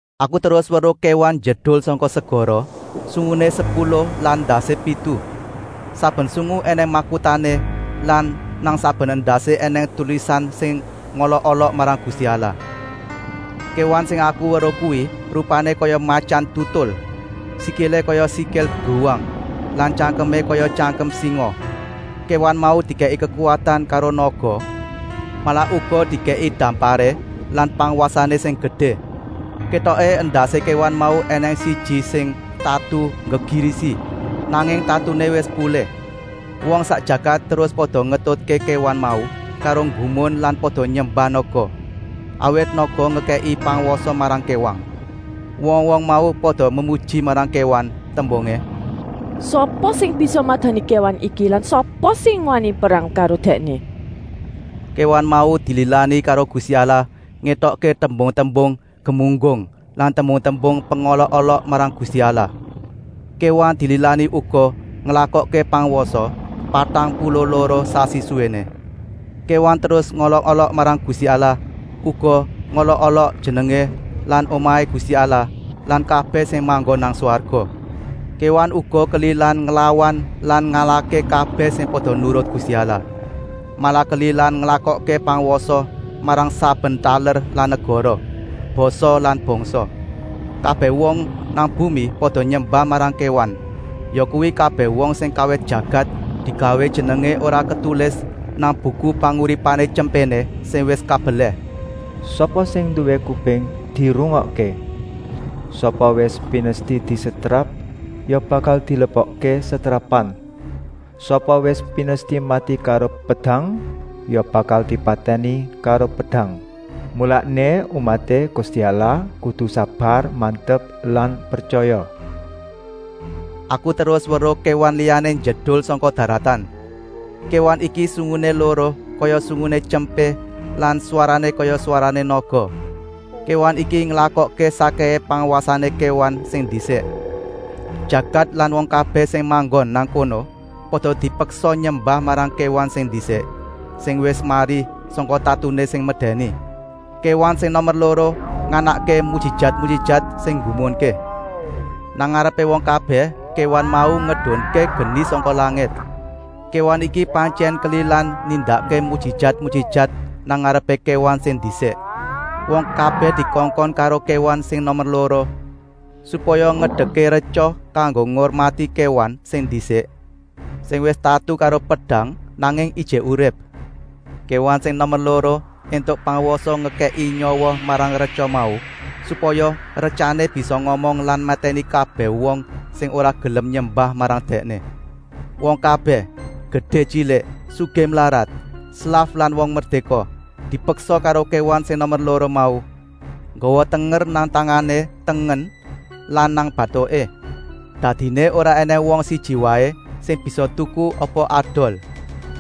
Aku terus weruh kéwan njedul sangka segara, sunguné sepuluh lan endasé pitu. Saben sungu ènèng makutané lan nang saben endasé ènèng tulisan sing ngolok-olok marang Gusti Allah. Kéwan sing aku weruh kuwi rupané kaya matyan tutul, sikilé kaya sikil bruwang lan tyangkemé kaya tyangkem singa. Kéwan mau dikèki kekuwatan karo naga, malah uga dikèki damparé lan pangwasané sing gedé. Kétoké endasé kéwan mau ènèng siji sing tatu nggegirisi, nanging tatuné wis pulih. Wong sak jagat terus pada ngetutké kéwan mau karo nggumun lan pada nyembah naga, awit naga ngekèki pangwasa marang kéwan. Wong-wong mau pada memuji marang kéwan, tembungé: “Sapa sing bisa madani kéwan iki lan sapa sing wani perang karo dèkné?” Kéwan mau dililani karo Gusti Allah ngetokké tembung-tembung gemunggung lan tembung-tembung pengolok-olok marang Gusti Allah. Kéwan dililani uga nglakokké pangwasa, patang puluh loro sasi suwéné. Kéwan terus ngolok-olok marang Gusti Allah, uga ngolok-olok jenengé lan omahé Gusti Allah lan kabèh sing manggon nang swarga. Kéwan uga kelilan nglawan lan ngalahké kabèh sing pada nurut Gusti Allah. Malah kelilan nglakokké pangwasa marang saben taler lan negara, basa lan bangsa. Kabèh wong nang bumi pada nyembah marang kéwan, yakuwi kabèh wong sing kawit jagat digawé jenengé ora ketulis nang Buku Panguripané Tyempéné sing wis kabelèh. “Sapa sing nduwé kuping, dirungokké! Sapa wis pinesti disetrap ya bakal dilebokké setrapan. Sapa wis pinesti mati karo pedang ya bakal dipatèni karo pedang. Mulané umaté Gusti Allah kudu sabar-mantep lan pretyaya.” Aku terus weruh kéwan liyané njedul sangka daratan. Kéwan iki sunguné loro kaya sunguné tyempé lan swarané kaya swarané naga. Kéwan iki nglakokké sakkèhé pangwasané kéwan sing ndisik. Jagat lan wong kabèh sing manggon nang kono pada dipeksa nyembah marang kéwan sing ndisik, sing wis mari sangka tatuné sing medèni. Kéwan sing nomer loro nganakké mujijat-mujijat sing nggumunké. Nang ngarepé wong kabèh kéwan mau ngedunké geni sangka langit. Kéwan iki pantyèn kelilan nindakké mujijat-mujijat nang ngarepé kéwan sing ndisik. Wong kabèh dikongkon karo kéwan sing nomer loro supaya ngedekké retya kanggo ngurmati kéwan sing ndisik, sing wis tatu karo pedang, nanging ijik urip. Kéwan sing nomer loro éntuk pangwasa ngekèki nyawa marang retya mau, supaya retyané bisa ngomong lan matèni kabèh wong sing ora gelem nyembah marang dèkné. Wong kabèh, gedé-tyilik, sugih-mlarat, slaf lan wong merdéka, dipeksa karo kéwan sing nomer loro mau, nggawa tenger nang tangané tengen lan nang batuké. Dadiné ora ènèng wong siji waé sing bisa tuku apa adol,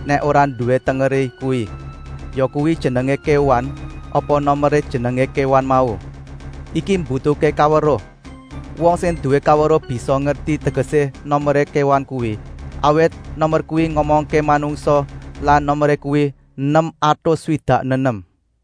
nèk ora nduwé tengeré kuwi, yakuwi jenengé kéwan apa nomeré jenengé kéwan mau. Iki mbutuhké kaweruh. Wong sing nduwé kaweruh bisa ngerti tegesé nomeré kéwan kuwi, awit nomer kuwi ngomongké manungsa lan nomeré kuwi nem atus swidak nenem.